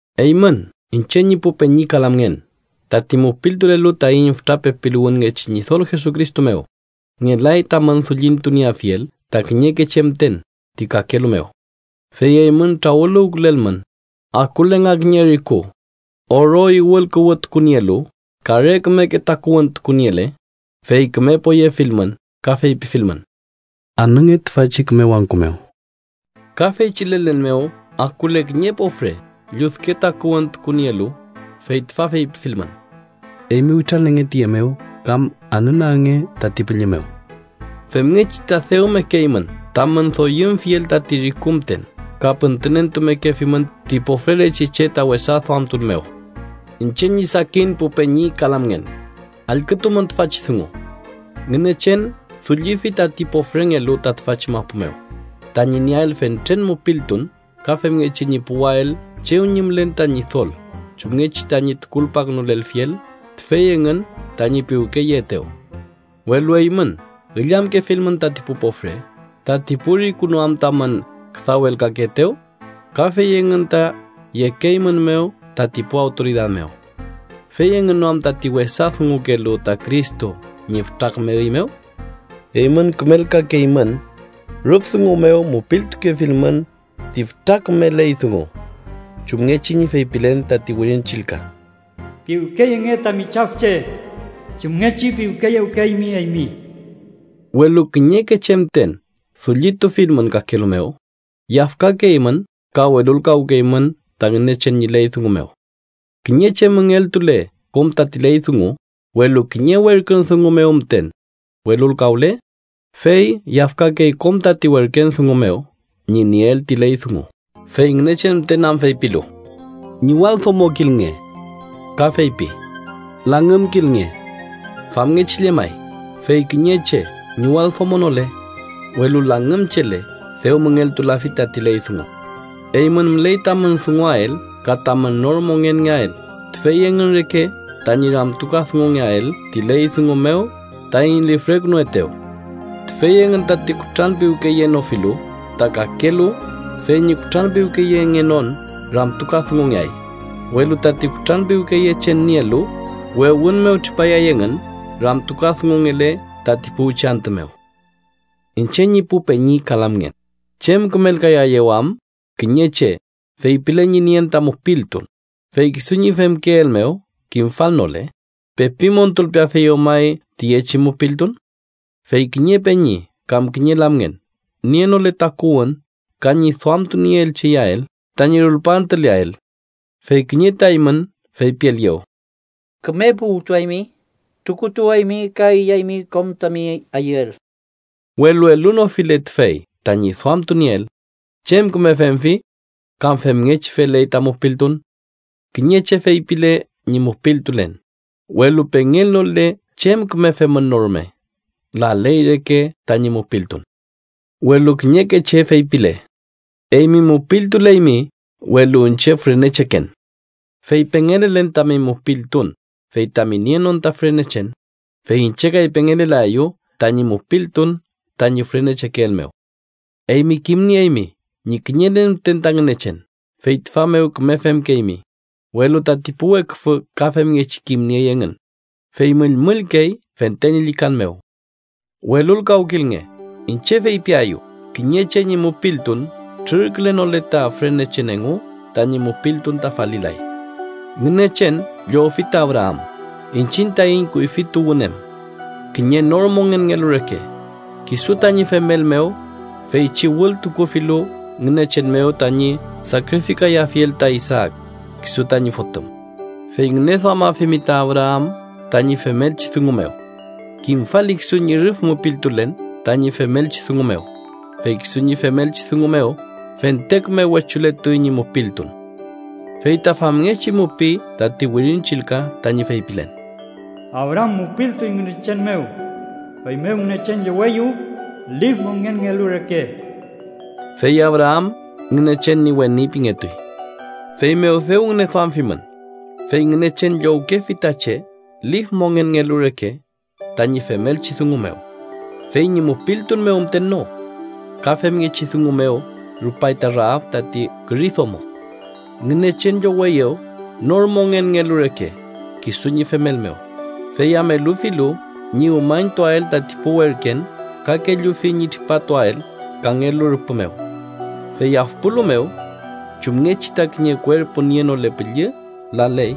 Eymün iñche ñi pu peñi ka lamngen, tati mupiltulelu taiñ fütra pepiluwünngechi Ñidol Jesucristo mew, ngelay tamün dullitunieafiel ta kiñeke che müten ti kakelu mew. Fey eymün trawüluwkülelmün, akule nga kiñe riku oro iwülkuwütukunielu ka re kümeke takuwün tukuniele, fey küme poyefilmün ka feypifilmün: “Anünge tüfachi küme wangku mew” ka feychi lelen mew akule kiñe pofre lludke takuwün tukunielu, fey tüfa feypifilmün: “Eymi witralenge tüye mew”, kam “anünagnge tati pülli mew”. Femngechi ta dew mekeymün tamün doyümfiel tati riku müten ka püntünentumekefimün ti pofrelechi che ta wesa duamtun mew. Iñche ñi sakin pu peñi ka lamngen, allkütumün tüfachi dungu: Ngünechen dullifi tati pofrengelu ta tüfachi mapu mew, tañi nieael fentren mupiltun ka femngechi ñi puwael chew ñi mülen ta Ñidol chumngechi tañi tukulpakünulelfiel tüfey engün tañi piwkeyekeetew. Welu eymün illamkefimün tati pu pofre. ¿Tati pu riku no am tamün küdawelkakeetew, ka fey engün ta yekeeymünmew tati pu awtoridad mew? ¿Fey engün no am tati wesa dungukelu ta Cristo ñi fütra küme üy mew? Eymün kümelkakeymün, rüf dungu mew mupitukefilmün ti fütra küme ley dungu, chumngechi ñi feypilen tati Wirin Chillka: “Piwkeyenge tami chafche chumngechi piwkeyewkeymi eymi.” Welu kiñeke che müten dullitufilmün kakelu mew, yafkakeymün ka welulkawkeymün ta Ngünechen ñi ley dungu mew. Kiñe che müngeltule kom tati ley dungu, welu kiñe werkün dungu mew müten welulkawle, fey yafkakey kom tati werken dungu mew ñi nieel ti ley dungu, fey Ngünechen müten am feypilu: “Ñiwaldomokilnge” ka feypi: “Langümkilnge.” Famngechi llemay, fey kiñe che ñiwaldomonole, welu langümchele, dew müngeltulafi tati ley dungu. Eymün müley tamün dunguael ka tamün nor mongenngeael tüfey engün reke tañi ramtukadungungeael ti ley dungu mew taiñ lifrekünuetew. Tüfey engün tati kutranpiwkeyenofilu ta kakelu fey ñi kutranpiwkeyengenon ramtukadungungeay, welu tati kutranpiwkeyechen nielu, wewün mew tripayay engün ramtukadungungele tati puwchi antü mew. Iñche ñi pu peñi ka lamngen, ¿chem kümelkayaeyew am kiñe che feypile ñi nien ta mupiltun, fey kisu ñi femkeel mew kimfalnole? ¿Pepi montulpeafeyew may tüyechi mupiltun? Fey kiñe peñi, kam kiñe lamngen, nienole takuwün ka ñi duamtunieelchi iyael tañi rulpaantüleael, fey kiñe ta eymün feypielieyew: “Küme puwtuaymi, tukutuwaymi ka iyaymi kom tami ayüel”, welu elunofile tüfey tañi duamtunieel, ¿chem küme femfi? Ka femngechi feley ta mupiltun. Kiñe che feypile ñi mupiltulen, welu pengelnole chem küme femün no rume, laley reke tañi mupiltun. Welu kiñeke che feypile: “¡Eymi mupiltuleymi, welu iñche fürenecheken!” Fey pengelelen tami mupiltun fey tami nienon ta fürenechen, fey iñche kay pengelelaeyu tañi mupiltun tañi fürenechekeel mew. Eymi kimnieymi ñi kiñelen müten ta Ngünechen, fey tüfa mew küme femkeymi. Welu tati pu weküfü ka femngechi kimniey engün, fey müllmüllkey fente ñi llükan mew. Welulkawkilnge. Iñche feypiaeyu: kiñe che ñi mupiltun trürkülenole ta fürenechen engu, tañi mupiltun ta falilay. Ngünechen llowfi ta Abraam, iñchiñ taiñ kuyfi tuwün em, kiñe nor mongenngelu reke, kisu tañi femel mew feychi wültukufilu Ngünechen mew tañi sakrifikayafiel ta Isaak, kisu tañi fotüm. Fey ngüneduamafimi ta Abraam tañi femelchi dungu mew: kimfali kisu ñi rüf mupiltulen tañi femelchi dungu mew, fey kisu ñi femelchi dungu mew fente küme wechulentuy ñi mupiltun. Fey ta famngechi mupiy tati Wirin Chillka tañi feypilen: “Abraam mupiltuy Ngünechen mew, feymew Ngünechen lloweyew lif mongenngelu reke.” Fey Abraam Ngünechen ñi weni pingetuy. Feymew dew ngüneduamfimün, fey Ngünechen llowkefi ta che lif mongenngelu reke tañi femelchi dungu mew, fey ñi mupiltun mew müten no. Ka femngechi dungu mew rupay ta Raab tati küri domo: Ngünechen lloweyew nor mongenngelu reke kisu ñi femel mew, fey am elufilu ñi umañtuael tati pu werken ka kellufi ñi tripatuael kangelu rüpü mew. Fey afpualu mew: chumngechi ta kiñe kuerpu nienole püllü laley,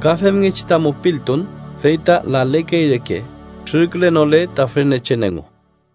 ka femngechi ta mupiltun fey ta lalekey reke trürkülenole ta fürenechen engu.